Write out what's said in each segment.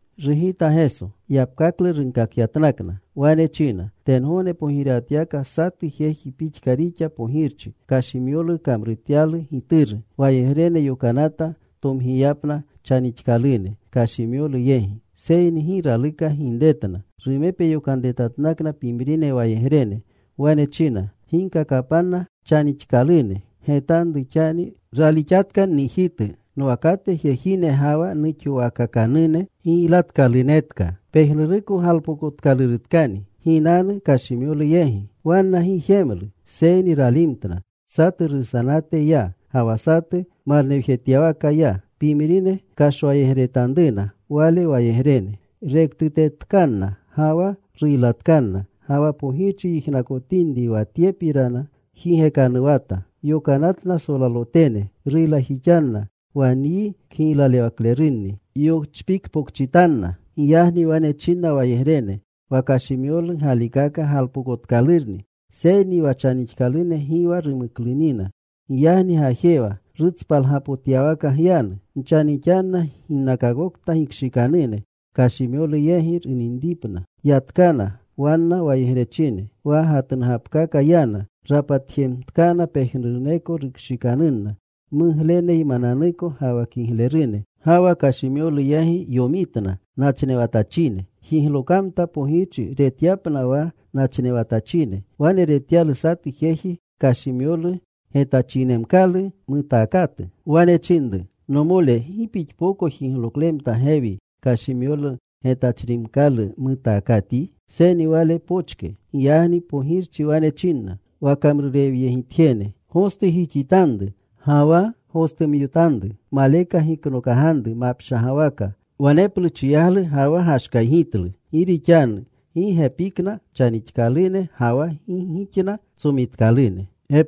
Rugita Geso. Yapkaklu runkakyatnakna. Wane china, “Tengogne pogirewatyawaka satu jeji pixka rixa pogirchi. Kashimyolu kamrutyalu gituru. Wayegrene yokanata tomgiyapna chanixkalune kashimyolu yegi. Seyni gi raluka ginretna. “Rumepe yokanretatnakna pimrine wayegrene. Wane china, ‘Ginkakapanna chanixkalune, “¡Getanru xani! Ralixatka nnijitu nwakate jejine ga wa nuxowaakakanune giylatkalunetka. Pejnuruko galpokotkalurutkani. Ginanu kashimyolu yegi.” ’ “Wanna gi jemlu, seyni ralimtna. Satu rusanate ya. Ga wa satu marnewjetyawaka ya. Pimrine kashwayegretanruna wale wayegrene. Rektutetkanna ga wa ruylatkanna. Ga wa pogirchi yijnakotinri wa tyepirana, jigekanuwata. Yokanatna solalotene. Ruylajixanna wa nyi kgiylalewaklerunni. Yochpikpokchitanna. “Giyagni wane chinna wayegrene, ‘Wa kashimyolu galikaka galpokotkalurni, seyni wa chanixkalune gi wa rumuklunina. Giyagni gajewa. Rutspalgapotyawaka gyanu. Nchanixanna ginnakokta gikshikanune, kashimyolu yegi yinripna.’ Yatkana wanna wayegrechine. Wa gatnugapkaka yana. Rapatjemtkana pejnuruneko rukshikanunna mugleneymananuko ga wa kiglerune. Ga wa kashimyolu yegi yomitna nachnewatachine. “Jiglokamta pogirchi retyapna wa nachnewatachine. Wane retyalu satu jeji kashimyolu getachinemkalu mutaakatu. Wane chinru, ‘Nomole, ¿gi pixpoko jigloklemta gewi wa kashimyolu getachrimkalu mutaakatyi?’ “Seyni wale pochke. Giyagni pogirchi wane chinna wa kamrurewyegitjene, ‘Gostujixitanru, ga wa gostumyotanru. Maleka giknokaganru mapshagawaka.’ Waneplu chiyaglu ga wa gashkaygitlu. “Gi rixanu gi gepikna chanixkalune, ga wa gi gixna tsomitkalune.”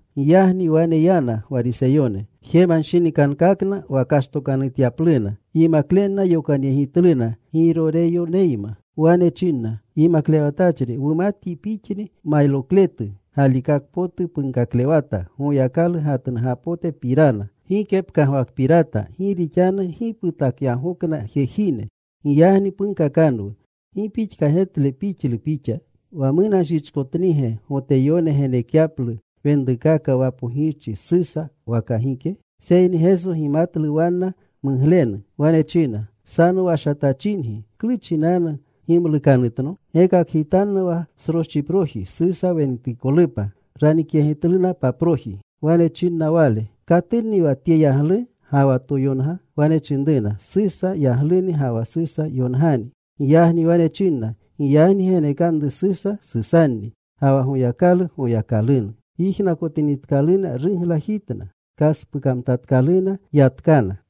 Giyagni wane yana Gwariseyone. Jemanshinikankakna wa kashtokanutyapluna. Yimaklenna yokanyegitluna Giroreyoneyma. Wane chinna, “Yimaklewatachri, wumatyi Pixni mayrokletu. Galikaka potu punkaklewata Goyakalu gatnugapotepirana. Gike pkagwakpirata, gi rixanu gi putakyagokna jejine. Giyagni punkakanwu. ¿Gi pixka getle pixlu Pixa? ¿Wa munanshichkotnige Goteyone genekyaplu wenrukaka wa Pogirchi Susa waka gike?” Seyni Geso gimatlu wanna muglenu. Wane china, “Sanowashatachingi, ¿klu chinanu gimlukanutno? Gekakgitanno wa sroschiproji Susa wenutikolupa.” Ranikyegitluna paproji. Wane chinna Wale, “¿Katunni wa tye yaglu ga wa toyonga?” Wane chinruna, “Susa yagluni ga wa Susa yongani.” Giyagni wane chinna, “Giyagni genekanru Susa Susanni, ga wa Goyakalu Goyakalunu.” Yijnakotinitkaluna, ruglajitna. Kaspukamtatkaluna. Yatkana.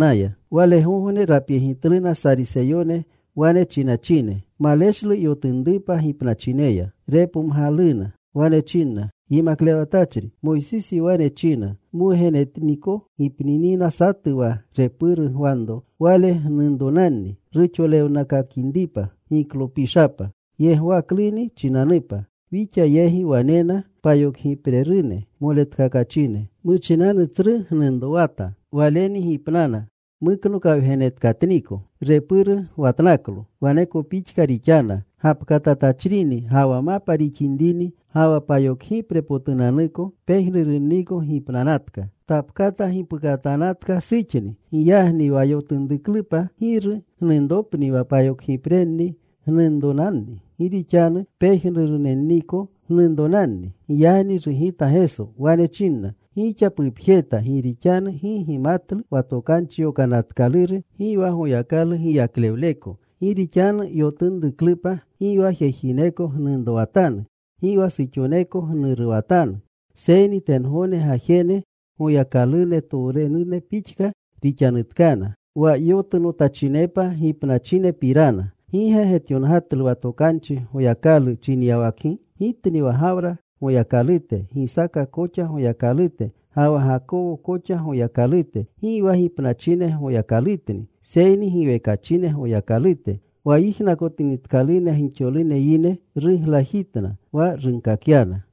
Walegogne rapyegitluna Sariseyone, wane chinachine maleshlu yotunrupa gipnachineya. Repomgaluna. Wane chinna, “Yimaklewatachri, Moysisi wane china: Mwugenetniko gipninina satu, wa repuru gwanro wale gnunronanni, ruxolewnakakinripa giklopishapa yegwakluni chinanupa. Wixa yegi wanena payokgiprerune moletkakachine. Muchinanu tsru gnunrowata. Waleni gipnanuna muknokawgenetkatniko. Repuru gwatnaklo. Waneko pixka rixana gapkatatachrini, ga wa mapa rixinrini, ga wa payokgiprepotunanniko. Pejnurunniko gipnanatka. Tapkata gipukatanatka suxni. Giyagni wa yotunruklupa ¿giru gnunropni wa payokgiprenni gnunronanni? Gi rixanu pejnurunenniko gnunronanni.” Giyagni rugita Geso. Wane chinna, “Gixa pupjeta gi rixanu gi gimatlu wa tokanchi yonatkaluru gi wa Goyakalu giyaklewleko. Gi rixanu yotunruklupa gi wa jejineko gnunrowatanu. Gi wa suxoneko gnuruwatanu, seyni tengogne gajene Goyakalutowrerune pixka rixanutkana. Wa yotunotachinepa gipnachinepirana, ¿gi ge getyongatlu wa tokanchi Goyakalu chinyawakgi? ‘Gitni wa Gawra Goyakalute, Gisaka koxa Goyakalute, ga wa Gakowo koxa Goyakalute.’ Gi wa gipnachine Goyakalutni, seyni giwekachine Goyakalute.” Wa yijnakotinitkaluna gixolune yine, ruglajitna wa runkakyana.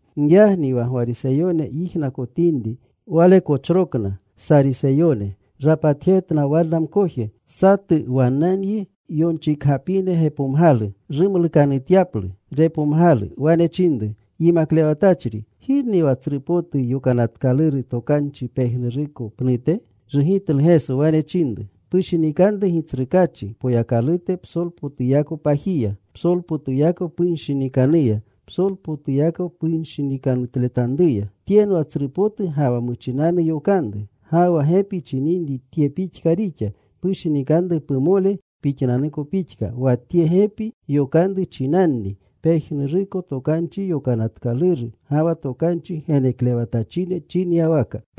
Giyagni wa Gwariseyone yijnakotinri Wale kochrokna Sariseyone, rapatjetna wanna mkoje. Satu wannanyi yonchikgapine gepomgalu. Rumlukanutyaplu, repomgalu. Wane chinru, “Yimaklewatachri, ¿girni wa tsru potu Yokanatkaluru Tokanchi pejnuruko pnute?” Rugitlu. Wane chinru, “Pushinikanru Gitsrukaachi Poyakalute psolpotuyako pajiya, psolpotuyako punshinikanuya, psolpotuyako pushinikanutletanruya. Tyenwa tsru potu ga wa muchinanu yokanru. Ga wa gepi chininri tye pixka rixa: Pushinikanru pumole pixnanuko pixka. Wa tye gepi yokanru chinanni pejnuruko Tokanchi Yokanatkaluru ga wa tokanchi geneklewatachine chinyawaka.”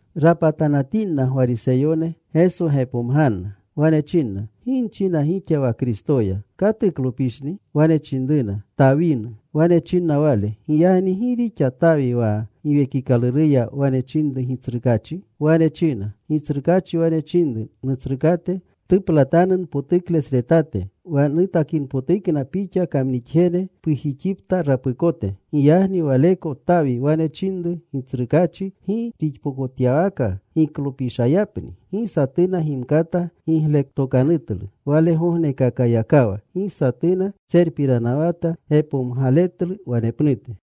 Rapatanatinna Gwariseyone, Geso gepomganna. Wane chinna, “¿Gi nchina gixa wa Kristoya? ¿Katuklopishni?” Wane chinruna, “Tawinu.” Wane chinna Wale, “Giyagni ¿gi rixa Tawi wa Giwekikaluruya wane chinru Gitsrukaachi? Wane china: Gitsrukaachi wane chinru Nutsrukate, ‘Ptuplatanu npotuklesretate, wa nutakinpotukna Pixa kamnixjene pujixipta rapukote.’ Giyagni waleko Tawi wane chininri Gitsrukaachi, ¿gi rixpokotyawaka giklopishayapni?” Gi satuna gimkata gigletokanutlu. Walegognekakayakawa gi satuna tserpiranawata gepomgaletlu wanepnute.